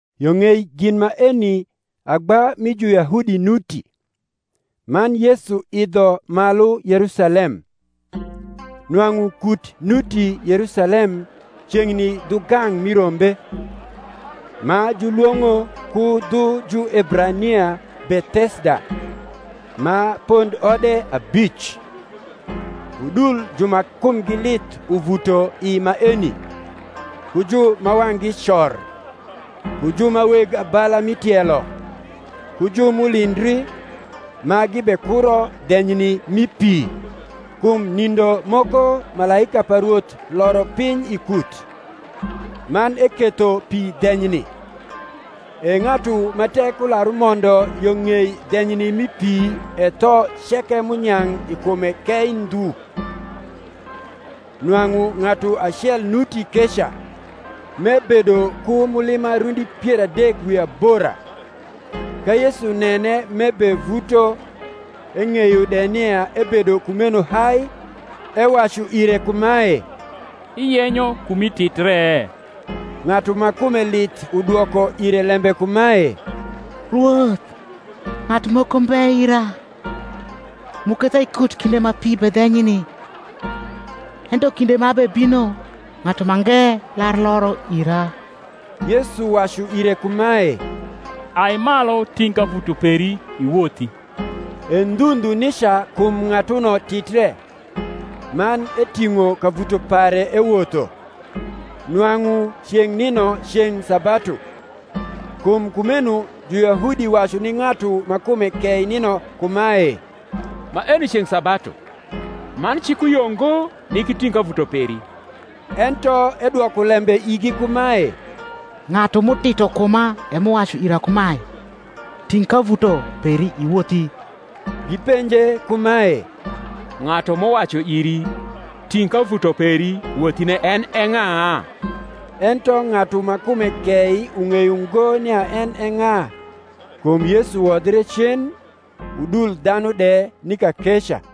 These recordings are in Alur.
Yo ng’ei gin maeni agba mi Juyahudi nuti; man Yesu idho malu Yerusalem. Nwang’u kut nuti Yerusalem ceng’ni dhu gang’ mi rombe, ma julwong’o ku dhu Juebrania Bethesda, ma pondode abic. Udul ju ma kumgi lith uvuto i maeni, ku ju ma wang’gi cor, ku ju ma weg abala mi tielo, ku ju m’ulindri, ma gibekuro dhenyni mi pi: kum nindo moko malaika pa Rwoth loro piny i kut, man eketho pi dhenyni: e ng’atu ma tek ular umondo yo ng’ei dhenyni mi pi e tho ceke m’unyang’ i kume kei ndhu. Nwang’u ng’atu acel nuti keca, m’ebedo ku mulima rundi pier adek wi abora. Ka Yesu nene m’ebevuto, eng’eyo de nia ebedo kumeno hai, ewacu ire kumae, Iyenyo kumi titre? Ng’atu ma kume lith udwoko ire lembe kumae, Rwoth, ng’atu moko mbe ira, m’uketha i kut kinde ma pi bedhenyni: ento kinde ma abebino ng’atu mange lar loro ira. Yesu wacu ire kumae, Ai malu ting’ kavuto peri, iwothi. E ndhu ndhu nica kum ng’atuno titre, man eting’o kavuto pare ewotho. Nwang’u ceng’ nino ceng’ sabatu. Kum kumeno Juyahudi wacu ni ng’atu ma kume kei nino kumae, Maeni ceng’ sabatu, man cik uyio ngo nik iting’ kavuto peri. Ento edwoko lembe igi kumae, Ng’atu m’utito kuma, e m’uwacu ira kumae, Ting’ kavuto peri, iwothi. Gipenje kumae, Ng’atu m’uwacu iri, Ting’ kavuto peri wothine en e ng’a? Ento ng’atu ma kume kei ung’eyo ngo nia en e ng’a; kum Yesu wodhre cen, udul dhanu de ni kakeca.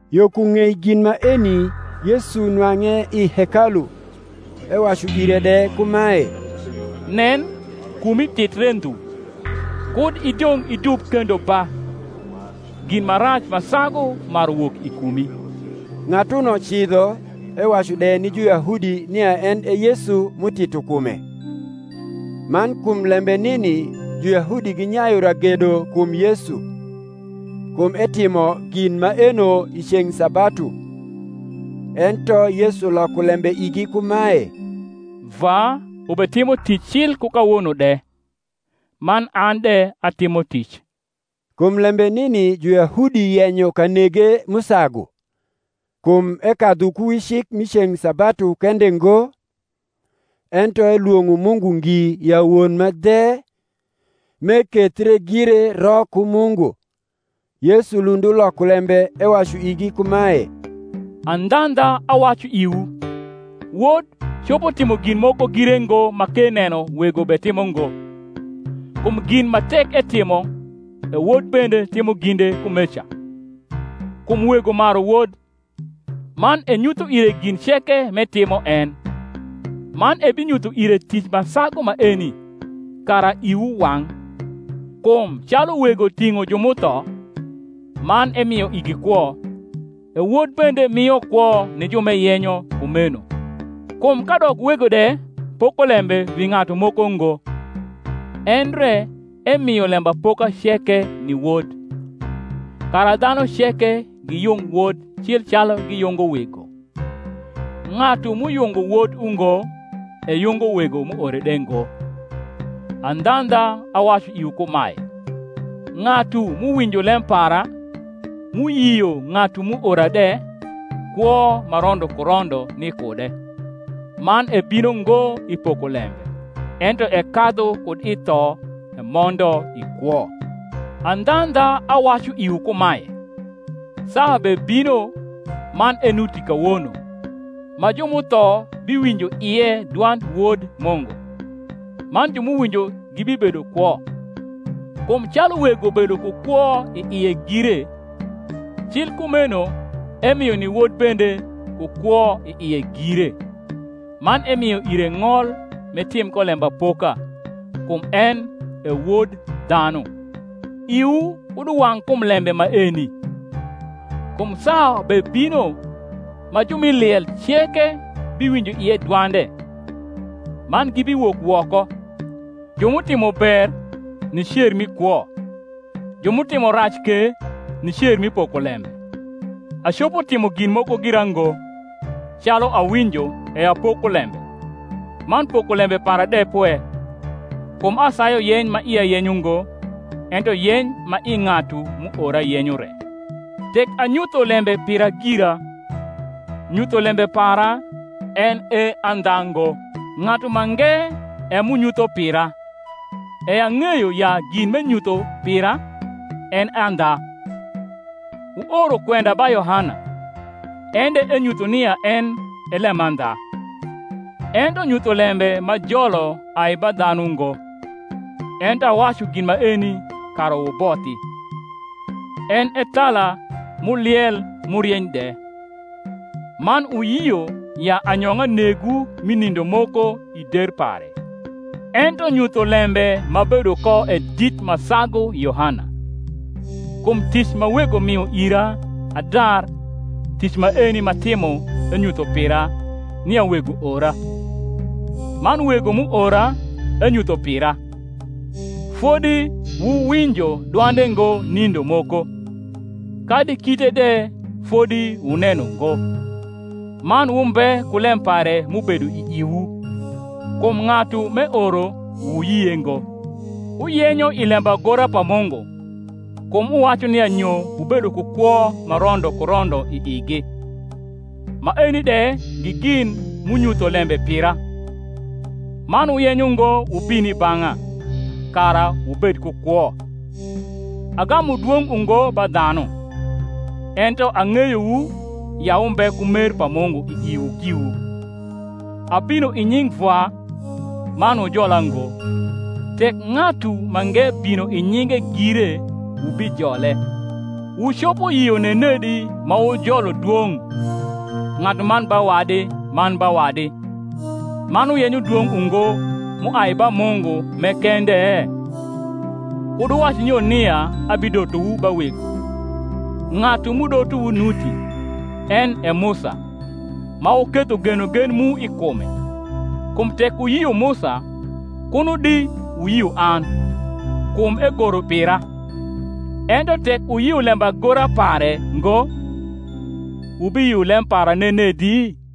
Yo ku ng’ei gin maeni Yesu nwang’e i hekalu, ewacu ire de kumae, Nen, kumi titre ndhu: kud idong’ idub kendo ba, gin ma rac ma sagu maru wok i kumi. Ng’atuno cidho ewacu de ni Juyahudi nia en e Yesu m’utito kume. Man kum lembe nini Juyahudi ginyayu ragedo kum Yesu, kum etimo gin maeno i ceng’ sabatu. Ento Yesu loko lembe igi kumae, Vwa ubetimo tic cil ku kawono de, man an de atimo tic. Kum lembe nini Juyahudi yenyo kanege m’usagu, kum ekadhu ku wi cik mi ceng’ sabatu kende ngo, ento elwong’o Mungu ngi ya Won ma dhe, m’ekethre gire ro ku Mungu. Yesu lund uloko lembe ewacu igi kumae, Andhandha, awacu iwu, Wod copo timo gin moko gire ngo ma k’eneno Wego betimo ngo: kum gin ma tek etimo, e Wod bende timo ginde kumeca. Kum Wego maru Wod, man enyutho ire gin ceke m’etimo en: man ebinyutho ire tic ma sagu maeni, kara iwu wang’. Kum calu Wego ting’o ju m’utho, man emio igi kwo, e Wod bende mio kwo ni ju m’eyenyo kumeno. Kum kadok Wego de poko lembe wi ng’atu moko ngo, endre emio lembapoka ceke ni Wod; kara dhanu ceke giyung Wod cil calu giyungo Wego. Ng’atu m’uyungo Wod ungo eyungo Wego m’uore de ngo. Andhaandha, awacu iwu kumae, Ng’atu m’uwinjo lem para, m’uyio ng’atu m’uora de, kwo ma rondo ku rondo ni kude, man ebino ngo i pokolembe, ento ekadhu kud i tho emondo i kwo. Andhandha awacu iwu kumae, Saa bebino, man enuti kawono, ma ju m’utho biwinjo ie dwand Wod Mungu; man ju m’uwinjo gibibedo kwo. Kum calu Wego bedo ku kwo i ie gire, cil kumeno emio ni Wod bende ku kwo i ie gire: man emio ire ng’ol m’etim ko lembapoka, kum en e Wod dhanu. Iwu kud uwang’ kum lembe maeni: kum saa bebino, ma ju m’i liel ceke biwinjo ie dwande, man gibiwok woko; ju m’utimo ber, ni cer mi kwo; ju m’utimo rac ke, ni cer mi pokolembe. Acopo timo gin moko gira ngo: calu awinjo, e apoko lembe: man pokolembe para de pwe; kum asayu yeny ma ia yenyo ngo, ento yeny ma i ng’atu m’uora yenyo re. Tek anyutho lembe pira gira, nyutholembe para en e andha ngo. Ng’atu mange e m’unyutho pira, e ang’eyo ya gin m’enyutho pira, en e andha. Wuoro kwenda ba Yohana, en de enyutho nia en e lemandha. Ento nyutholembe m’ajolo ai ba dhanu ngo: ento awacu gin maeni, kara wubothi. En e thala m’uliel m’urieny de; man wuyio ya anyong’a negwu mi nindo moko i der pare. Ento nyutholembe m’abedo ko e dit ma sagu Yohana; kum tic ma Wego mio ira adar, tic maeni m’atimo enyutho pira, nia Wego ora. Man Wego m’uora, enyutho pira. Fodi wuwinjo dwande ngo nindo moko, kadi kite de fodi wuneno ngo. Man wumbe ku lem pare m’ubedo i iwu: kum ng’atu m’eoro, wuyie ngo. Wuyenyo i lembagora pa Mungu, kum wuwacu nia nyo wubedo ku kwo ma rondo ku rondo i igi; maeni de gi gin m’unyutho lembe pira; man wuyenyo ngo wubin i bang’a, kara wubed ku kwo. Agamu dwong’ ungo ba dhanu. Ento ang’eyowu ya wumbe ku mer pa Mungu i iwu giwu. Abino i nying’ Vwa, man wujola ngo: tek ng’atu mange bino i nyinge gire, wubijole. Wucopo yio nenedi ma wujolo dwong’ ng’atuman ba wadi man ba wadi, man wuyenyo dwong’ ungo m’uai ba Mungu m’e kende? Kud wuwac nyo nia abidotowu ba Wego: ng’atu m’udotowu nuti, en e Musa, ma wuketho genogen mu i kume. Kum tek wuyio Musa, kuno di wuyio an; kum egoro pira. Ento yek wuyio lembagora pare ngo, wubiyio lem para nenedi?